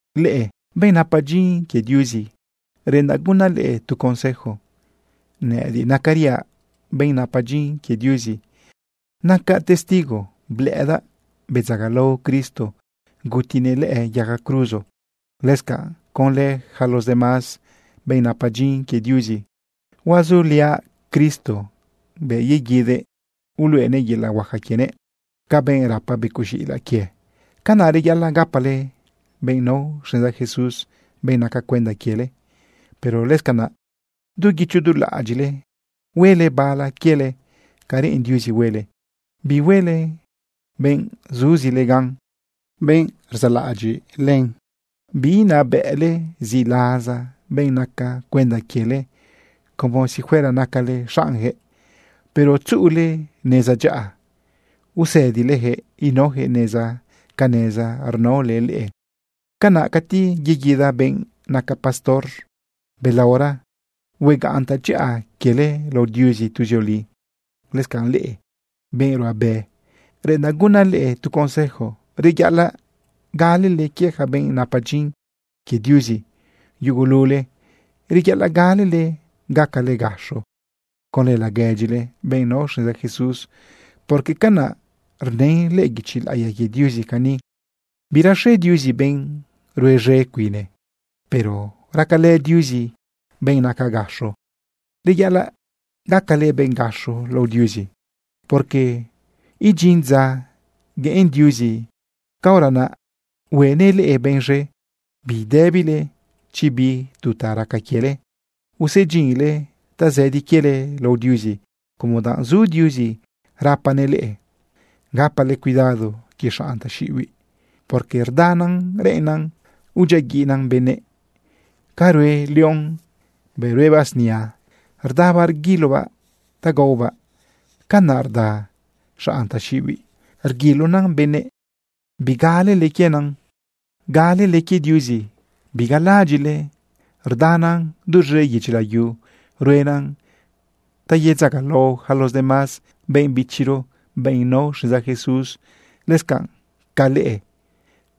Leꞌe benꞌ napa dyin quie Diuzi, reꞌendaꞌ gunaꞌ leꞌe tu consejo. Nëꞌëdiꞌ nacariaꞌ benꞌ napa dyin quie Diuzi. Nacaꞌ testigo blëꞌëdaꞌ bedzagalao Cristo gutinëꞌ lëꞌë yaga cruzo. Lëscanꞌ conlë yaca los demás benꞌ napa dyin quie Diuzi, huazuliaꞌ Cristo bëꞌ yeguidëꞌ uluꞌenëꞌ yelaꞌ huaca quienëꞌ. Ca benꞌ rapa becoꞌ z̃iꞌilaꞌ quie, canaꞌ reyaꞌalaꞌ gapale benꞌ nao xneza Jesús, benꞌ naca cuenda quiele. Pero lëscanaꞌ du guicho du laꞌadyiꞌle huele bala quiele ca reꞌen Diuzi huele, bihuele benꞌ zuzile gan, benꞌ rzaꞌlaꞌadyiꞌ len. Biinabëꞌle ziꞌlaza benꞌ naca cuenda quiele como si fuera nacale xaꞌnyaquëꞌ, pero tzuꞌule neza dyaꞌa usëdilejëꞌ inaojëꞌ neza ca neza rnaole leꞌe. Canaꞌ cati yeguida benꞌ naca pastor belaora, huegaꞌn tadyaꞌa quiele lao Diuzi tuzioli. Lëscanꞌ leꞌe, benꞌ ruꞌabe, reꞌendaꞌ gunaꞌ leꞌe tu consejo. Reyaꞌalaꞌ galele quie yaca benꞌ napa dyin quie Diuzi. Yugulule reyaꞌalaꞌ galale gacale gaxo conlë laguedyile, benꞌ nao xneza Jesús, porque canaꞌ rnën lëꞌë guichi laꞌiya quie Diuzi cani: Biraxe Diuzi benꞌ rue z̃e cuine, pero racalë Diuzi benꞌ naca gaxo. Reyaꞌalaꞌ gacale benꞌ gaxo lao Diuzi, porque idyin dza gueꞌen Diuzi, caora naꞌ huenëꞌ leꞌe benꞌ z̃e. Bidëbile chi bi tu ta raca quiele. Usedyinle tazëdi quiele lao Diuzi como danꞌ zu Diuzi rapanëꞌ leꞌe. Gapale cuidado quie xanꞌ taxiꞌibiꞌ, porque rdanan reꞌennan udyiaguiꞌnan benëꞌ. Ca rue león bëꞌ ruebaꞌ snia, rdabaꞌ rguilobaꞌ ta gaobaꞌ, canaꞌ rda xanꞌ taxiꞌibiꞌ reguilonan benëꞌ. Bigalele quienan, galele quie Diuzi. Bigalaꞌadyiꞌle rdanan duz̃e yedyi layu ruenan ta yedzagalao yaca los demás benꞌ bichiro, benꞌ nao xneza Jesús, lëscanꞌ ca leꞌe.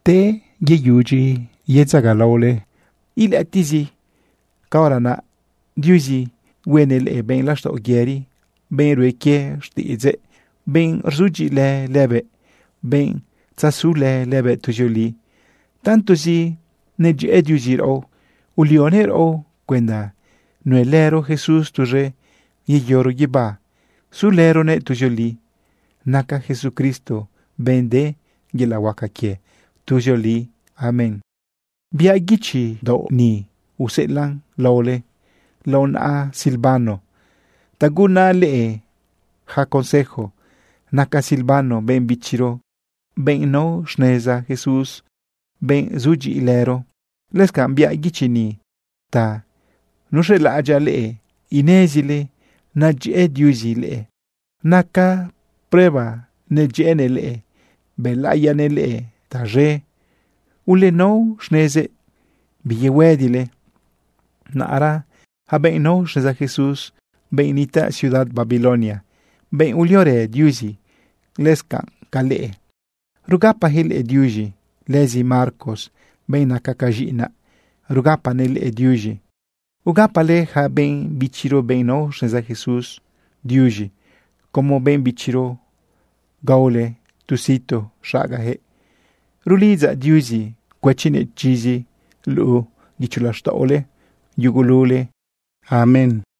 Te yeyudyi yedzagalaole ilëꞌëtiꞌzi, caora naꞌ Diuzi huenëꞌ leꞌe benꞌ laxtaꞌo yëri, benꞌ rue quie xtiꞌidzëꞌ, benꞌ rzudyiꞌilë lëbëꞌ, benꞌ tzazulë lëbëꞌ tuzioli. Tantozi nedyëꞌë Diuzi raꞌo, ulionëꞌ raꞌo cuenda nuelëro Jesús tuz̃e, yeyoro guibá sulëronëꞌ tuzioli. Naca Jesucristo benꞌ de yelaꞌ huaca quie tuzioli. Amén. Biaꞌ guichi daoꞌ ni useꞌelaꞌn laole lao naꞌa Silvano ta gunaꞌ leꞌe yaca consejo. Naca Silvano benꞌ bichiro, benꞌ nao xneza Jesús, benꞌ zudyiꞌilëro. Lëscanꞌ biaꞌ guichi ni ta nuxelaꞌadyaꞌ leꞌe inezile nadyëꞌë Diuzi leꞌe. Naca prueba nedyëꞌënëꞌ leꞌe bëlaꞌiyanëꞌ leꞌe taz̃e. Ulenao xnezëꞌ, biyehuëdile. Naꞌra yaca benꞌ nao xneza Jesús, benꞌ nitaꞌ ciudad Babilonia, benꞌ uliorë Diuzi lëscanꞌ ca leꞌe, rugapajëꞌ leꞌe diuz̃i. Lëzi Marcos, benꞌ naca ca z̃iꞌinaꞌ, rugapanëꞌ leꞌe diuz̃i. Ugapale yaca benꞌ bichiro, benꞌ nao xneza Jesús, diuz̃i. Como benꞌ bichiro gaole tu situ xagajëꞌ. Rulidzaꞌ Diuzi cuëchinëꞌ chizi luꞌu guicho laxtaꞌole yugulule. Amén.